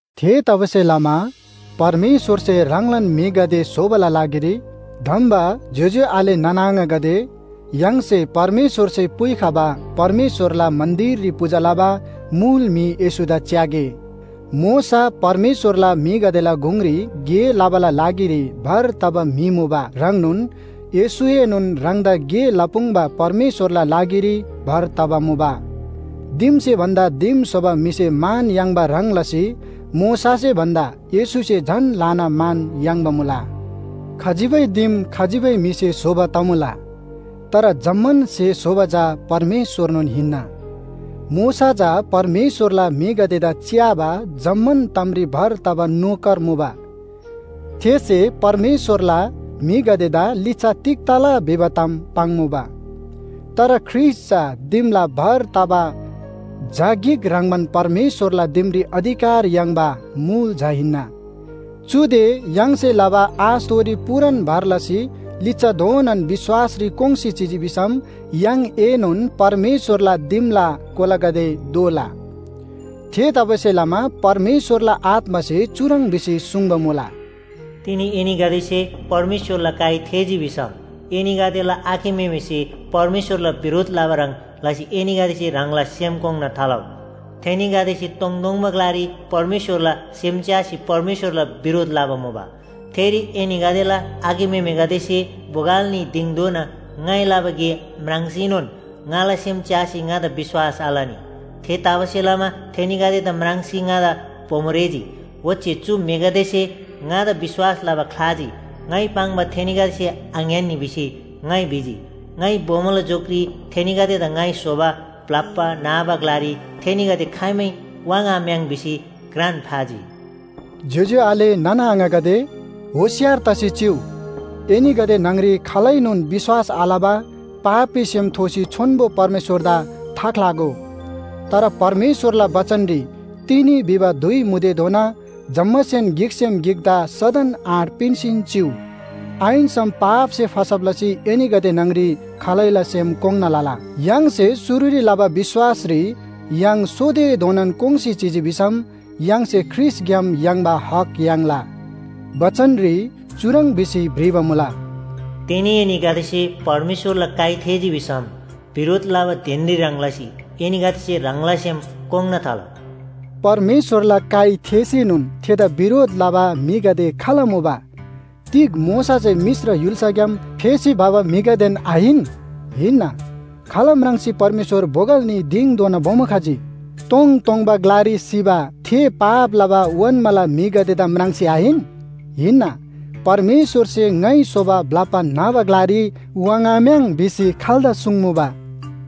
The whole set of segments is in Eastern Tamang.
थेतबासेलमा परमेश्‍वरसे ह्राङलान म्‍हिगदे स्‍होबाला लागिरी धम्‍बा ज्‍योज्‍यो आले नाना आङागदे, य्‍हाङसे परमेश्‍वरसे पुइखबा परमेश्‍वरला मन्‍दिररी पूजा लबा मुल म्‍हि येशूदा च्‍यागे। मोशा परमेश्‍वरला म्‍हिगदेला गुङरी गे लबाला लागिरी भर तबा म्‍हि मुबा ह्रङ्नोन येशूएनोन ह्राङदा गे लपुङ्बा परमेश्‍वरला लागिरी भर तबा मुबा। दिमसे भन्‍दा दिम स्‍होबा म्‍हिसे मान याङ्बा ह्रङ् लसी मोशासे भन्‍दा येशूसे झन ल्‍हाना मान याङ्बा मुला। खजिबै दिम खजिबै म्‍हिसे स्‍होबा तमुला। तर जम्‍मान स्‍हे स्‍होबा चा परमेश्‍वरनोन हिन्‍ना। मोशा चा परमेश्‍वरला म्‍हिगदेदा च्‍याबा जम्‍मान तामरी भर तबा नोकर मुबा। थेसे परमेश्‍वरला म्‍हिगदेदा लिच्‍छा तिग तला भिबा ताम पाङ्मुबा। तर ख्रीष्‍ट चा दिमला भर तबा झा गिक ह्रङ्‌बान परमेश्‍वरला दिमरी अधिकार याङ्बा मुल झा हिन्‍ना। चुदे य्‍हाङसे लबा आशथोरी पूरान भर लसी लिच्‍छाधोनान विश्‍वासरी कोङ्‌सी चिजी भिसम य्‍हाङएनोन परमेश्‍वरला दिमला कोलागदे दोला। थेतबासेलमा परमेश्‍वरला आत्‍मासे चुह्रङ् भिसी सुङ्बा मुला, “तिनी एनीगदेसे परमेश्‍वरला काइ थेःजी भिसम, एनीगदेला आखे म्‍हेमेसे परमेश्‍वरला बिरोध लबा ह्रङ् लसी एनीगदेसे ह्राङला सेम कोङ्‌ना थालउ। थेनीगदेसे तोङतोङबा ग्‍लारी परमेश्‍वरला सेम च्‍यासी परमेश्‍वरला बिरोध लबा मुबा। थेरी एनीगदेला आखे म्‍हेमेगदेसे बोगल न्‍ही दिङधोना ङाइ लबा गे म्राङ्सीनोन ङाला सेम च्‍यासी ङादा विश्‍वास आलनी। थेतबासेलमा थेनीगदेदा म्राङ्सी ङादा बोमो रेःजी। ओच्‍छे ‘चु म्‍हिगदेसे ङादा विश्‍वास लबा ख्‍लाजी, ङाइ पाङ्बा थेनीगदेसे आङ्‌यान्‍नी’ भिसी ङाइ भिजी। ङाइ बोमोला झोकरी थेनीगदेदा ‘ङाइ स्‍होबा ब्‍लप्‍बा न्‍हबा ग्‍लारी थेनीगदे खाइमै वाङ्‌आम्‍याङ्’ भिसी घ्रान फाजी।” ज्‍योज्‍यो आले नाना आङागदे, होशियार तसी चिउ। एनीगदे न्‍हङरी खालैनोन विश्‍वास आलबा पापी सेम थोसी छोन्‍बो परमेश्‍वरदा थाख्‍लागो। तर परमेश्‍वरला बचनरी “तिनी” भिबा धुइ मुतेधोना जम्‍मासेन गिकसेम गिकदा सदन आँट पिन्‍सीन चिउ। आहिन्‍सम पापसे फसब लसी एनीगदे न्‍हङरी खालैला सेम कोङ्‌ना लला। य्‍हाङसे शुरुरी लबा विश्‍वासरी य्‍हाङ सोतेधोना कोङ्‌सी चिजी भिसम य्‍हाङसे ख्रीष्‍टग्‍याम याङ्बा हक याङ्ला। बचनरी चुह्रङ् भिसी भ्रिबा मुला, “तिनी एनीगदेसे परमेश्‍वरला काइ थेःजी भिसम बिरोध लबा धिनरी ह्रङ् लसी एनीगदेसे ह्राङला सेम कोङ्‌ना थालउ।” परमेश्‍वरला काइ थेःसीनोन थेदा बिरोध लबा म्‍हिगदे खाल मुबा? तिग मोशासे मिश्र य्‍हुल्‍साग्‍याम फेसी भबा म्‍हिगदेन आहिन? हिन्‍ना। खाल म्राङ्सी परमेश्‍वर बोगल न्‍ही दिङधोना बोमो खजी? तोङतोङबा ग्‍लारी सिबा थे पाप लबा ओन्‍माला म्‍हिगदेदा म्राङ्सी आहिन? हिन्‍ना। परमेश्‍वरसे ङाइ स्‍होबा ब्‍लप्‍बा न्‍हबा ग्‍लारी वाङ्‌आम्‍याङ् भिसी खाल्‍दा सुङ्मुबा?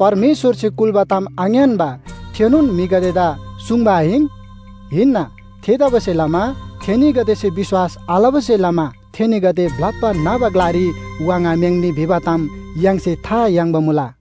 परमेश्‍वरसे कुल्‍बा ताम आङ्‌यान्‍बा थेनोन म्‍हिगदेदा सुङ्बा आहिन? हिन्‍ना। थेतबासेलमा थेनीगदेसे विश्‍वास आलबासे लमा थेनीगदे ब्‍लप्‍बा न्‍हबा ग्‍लारी वाङ्‌आम्‍याङ्‌नी भिबा ताम य्‍हाङसे था याङ्बा मुला।